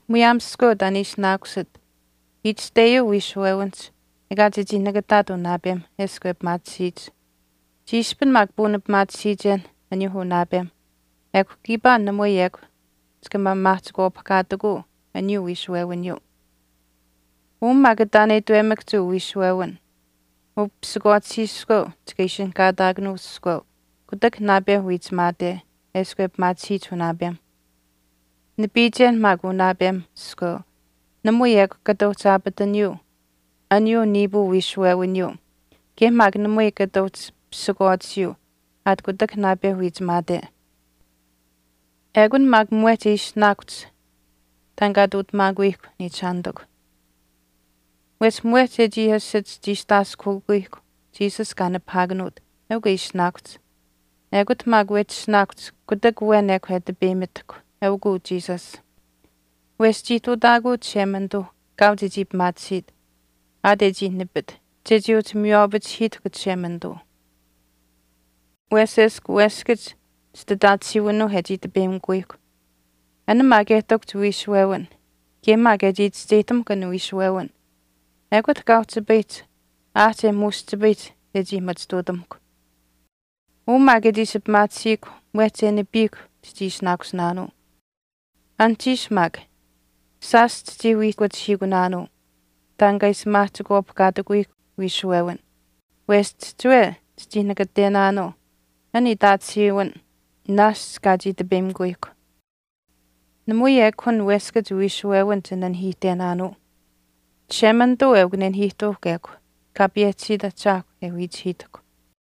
Muyaam iskweu taan e ishinaakusit, itashteyuu wiishuwewinihch ekaa chechii nakataat unaapem eshkw e pimaatisiyich. Chiishpin maak puunipimaatisiichenh aniyuu unaapemh ekw kiipaa namui ekw chika maamaahchikwaapihkaatikuu aniyuu wiishuwewiniyuu. Uu maak taan e itwemakahch uu wiishuwewin upisikwaatisiiskweu chika ishinihkaataakanuu iskweu kutak naapeuh wiichimaate eshkw e pimaatisiyich unaapemh. Nipiichen maak unaapem iskweu namui ekw kata uhchi aapataniyuu aniyuu niipuu wiishuwewiniyuu kaye maak namui kata uhchi pisikwaatisiyuu aat kutak naapeuh wiichimaate. Ekun maak mwehch e ishinaakuhch taan kaa ihtuutamaakuyihkw, niichishaanitikw. Wesh mwehch e chii asich chiistaaskuhiikuyihkw Jesus kaa nipahaakanuut eukw e ishinaakuhch. Ekut maak wehchi ishinaakuhch kutak awen ekw e tipeyimitahkw, eukuu Jesus. Wesh chii ihtuutaakuu Chishemanituu kaau chechii pimaatisiit aat e chii nipit chechii uhchi miywaapachihiitahkw Chishemanituu. Wesh eshkw weskach chititaatisiiwinuuh e chii tipeyimikuyihkw, an maak e ihtakuhch wiishuwewin kaye maak e chii chischeyihtamuhkw an wiishuwewin, ekut kaa uhchipayihch aahch e muushchipayihch chechii machituutamuhkw. Uu maak e chii ishi pimaatisiihkw mwehch e nipiihkw chichii ishinaakusinaanuu. Anuhchiish maak shaash chichii wiihkuchihiikunaanuu taan kaa ishi maahchikwaapihkaatikuyihkw wiishuwewin, wesh chihchiwe chichii nakatenaanuu an itaatisiiwin naashch kaa chii tipeyimikuyihkw. Namui ekw an weskach wiishuwewin chinanihiihtenaanuu. Chishemanituu eukw nenahiihtuuhkw ekw, Kaa payehchisiit Ahchaahkw e wiichihiitahkw.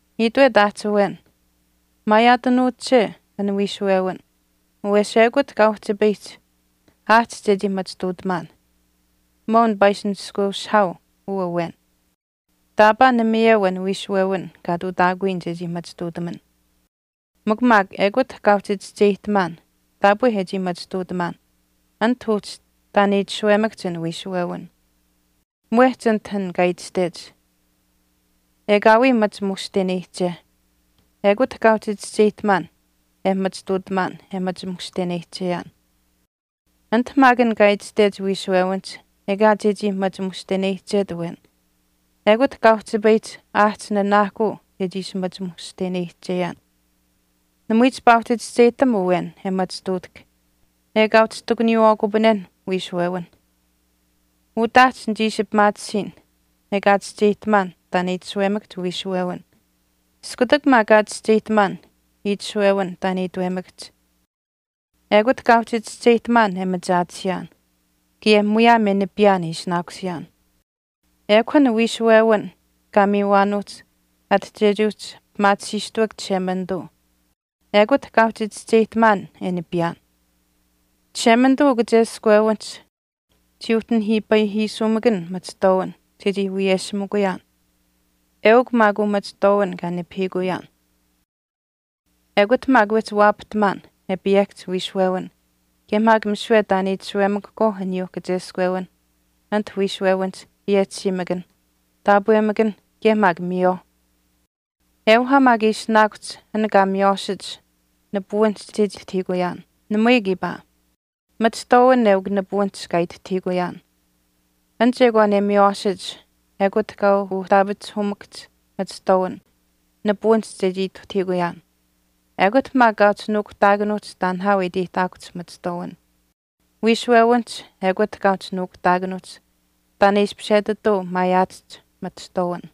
Itwet aahch awen, maayaatanuuche an wiishuwewin wesh ekut kaa uhchipayihch aahch chechii machituutamaan. Mwaau nipaa ishi nishkweushihaau uu awen, taapaa namayeu an wiishuwewin kaa ihtuutaakuyaan chechii machituutamaan. Mikw maak ekut kaa uhchi chischeyihtamaan taapwe e machituutamaan anite uhchi taan e itashuwemakahch an wiishuwewin. Mwehch anit an kaa itashtech, “Ekaawii machi mushteneyihche,” ekut kaa uhchi chischeyihtamaan e machituutamaan e machi mushteneyihcheyaan. Anit maak an kaa itashtech wiishuwewinihch ekaa chechii machi mushteneyihchet awen ekut kaa uhchipayihch aahch nanaahkuu chechii ishi machi mushteneyihcheyaan. Namui chipaa uhchi chischeyihtam awen e machituutahk ekaa uhchi ihtakuniyiwaakupanenh wiishuwewinh. Utaahch nichii ishi pimaatisiin ekaa chischeyihtamaan taan e itashuwemakahch wiishuwewin. Iskutak maak kaa chischeyihtamaan itashuwewin taan itwemakahch, ekut kaa uhchi chischeyihtamaan e machaatisiyaan kaye muyaam e nipiyaan e ishinaakusiyaan. Ekw an wiishuwewin kaa miiwaanuuhch ati chechii uhchi pimaatisiistuuk Chishemanituu, ekut kaa uhchi chischeyihtamaan e nipiyaan. Chishemanituu ukacheskwewinihch chii uhchi nihiipayihiisuumakan machihtwaawin chechii wiyeshimikuyaan. Eukw maak uu machihtwaawin kaa nipahiikuyaan. Ekut maak wehchi waapahtamaan e payehkahch wiishuwewin. Kaye maak misiwe taan itashuwemakahkwaau aniyuuh kascheskwewinh anit wiishuwewinihch payehchisiimakanh, taapwemakanh, kaye maak miyawaauh. Euhaa maak e ishinaakuhch an kaa miywaashich nipuwinihch chechii ituhtahiikuyaan. Namui kiipaa. Machihtwaawin eukw nipuwinihch kaa ituhtahiikuyaan. An chekwaan e miywaashich ekut kaa uhtaapachihuumakahch machihtwaawin nipuwinihch chechii ituhtahiikuyaan. Ekut maak kaa uhchi nuukuhtaakanuuhch taan nihaau e iteyihtaakuhch machihtwaawin. Wiishuwewinihch ekut kaa uhchi nuukuhtaakanuuhch taan e ishpish etituu maayaatahch machihtwaawin.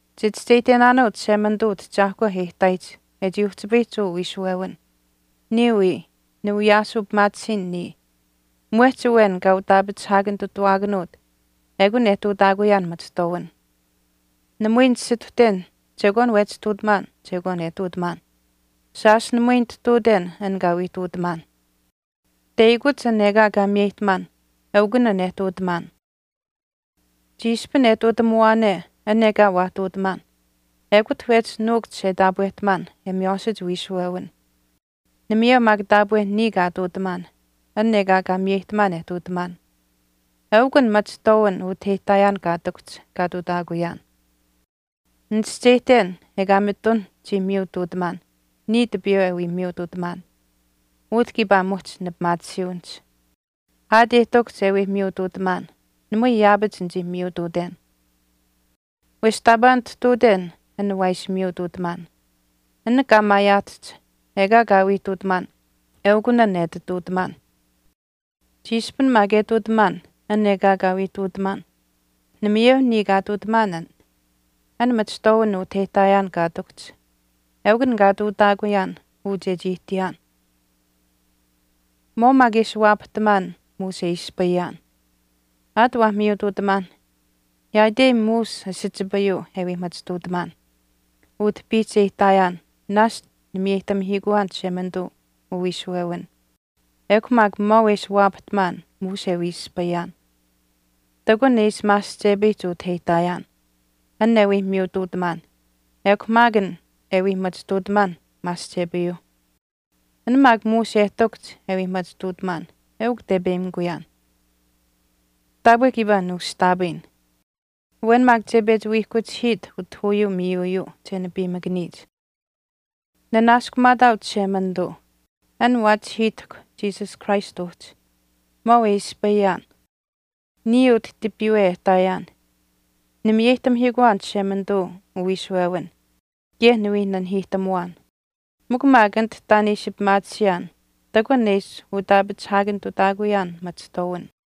Chichischeyihtenaanuu Chishemanituu utahchaahkwa e ihtaayich e chii uhchipayihch uu wiishuwewin. Niya wii, niwiyaasuu pimaatisiin niya. Mwehch awen kaa utaapachihaakanitutawaakanuut ekun e ihtuutaakuyaan machihtwaawin. Namui ninisituhten chekwaan wehchi ihtuutamaan chekwaan e ihtuutamaan. Shaash namui nitihtuuten an kaa wii ihtuutamaan, teyakuch an ekaa kaa miyeyihtamaan ekun an e ihtuutamaan. Chiishpin e ihtuutamuwaane an ekaa waa ihtuutamaan ekut wehchi nuukuhch e taapwehtamaan e miywaashich wiishuwewin. Namayeu maak taapwe niya kaa ihtuutamaan an ekaa kaa miyeyihtamaan e ihtuutamaan. Eukw an machihtwaawin utah e ihtaayaan kaa ihtakuhch kaa ihtuutaakuyaan. Nichischeyihten ekaa mitun chii miyutuutamaan niya tipiiwe e wii miyutuutamaan, utah kiipaa muhch nipimaatisiiwinihch. Aat e ihtakuhch e wii miyutuutamaan namui yaapach nichii miyutuuten. Wesh taapaa nitihtuuten an waa ishi miyutuutamaan. An kaa maayaahtahch ekaa kaa wii ihtuutamaan eukun e ati ihtuutamaan. Chiishpin maak e ihtuutamaan an ekaa kaa wii ihtuutamaan, namayeu niya kaa ihtuutamaan an. An machihtwaawin utah e ihtaayaan kaa ihtakuhch eukun an kaa ihtuutaakuyaan uu chechii ihtiyaan. Maau maak e ishi waapahtamaan muush e ispayaan. Aat waah miyutuutamaanh yaaitei muush asichipayuu e wii machituutamaan. Utah piihch e ihtaayaan naashch nimiyeyihtamihiikuwaan Chishemanituu uwiishuwewin. Ekw mikw maau e ishi waapahtamaan muush e wii ispayaan. Ihtakun e ishi maasihchepayihch utah e ihtaayaan, an e wii miyutuutamaan ekw maak an e wii machituutamaan maasihchepayuu. An maak muush e ihtakuhch e wii machituutamaan eukw tepeyimikuyaan. Taapwe kiipaa nuushtaapayin. Awen maak che pechi wiihkuchihiit utah uyuu miiyuuyuu che nipiimakaniyich. Nanaaskumaataau Chishemanituu an waachihiitahk Jesus Christ uhchi. Maau e ispayaan. Niya utah tipiiwe e ihtaayaan nimiyeyihtamihiikuwaan Chishemanituu uwiishuwewin kaye niwii nanihiihtamuwaan. Mikw maak anit taan e ishi pimaatisiyaan ihtakun e ishi utaapachihaakanitutaakuyaan machihtwaawin.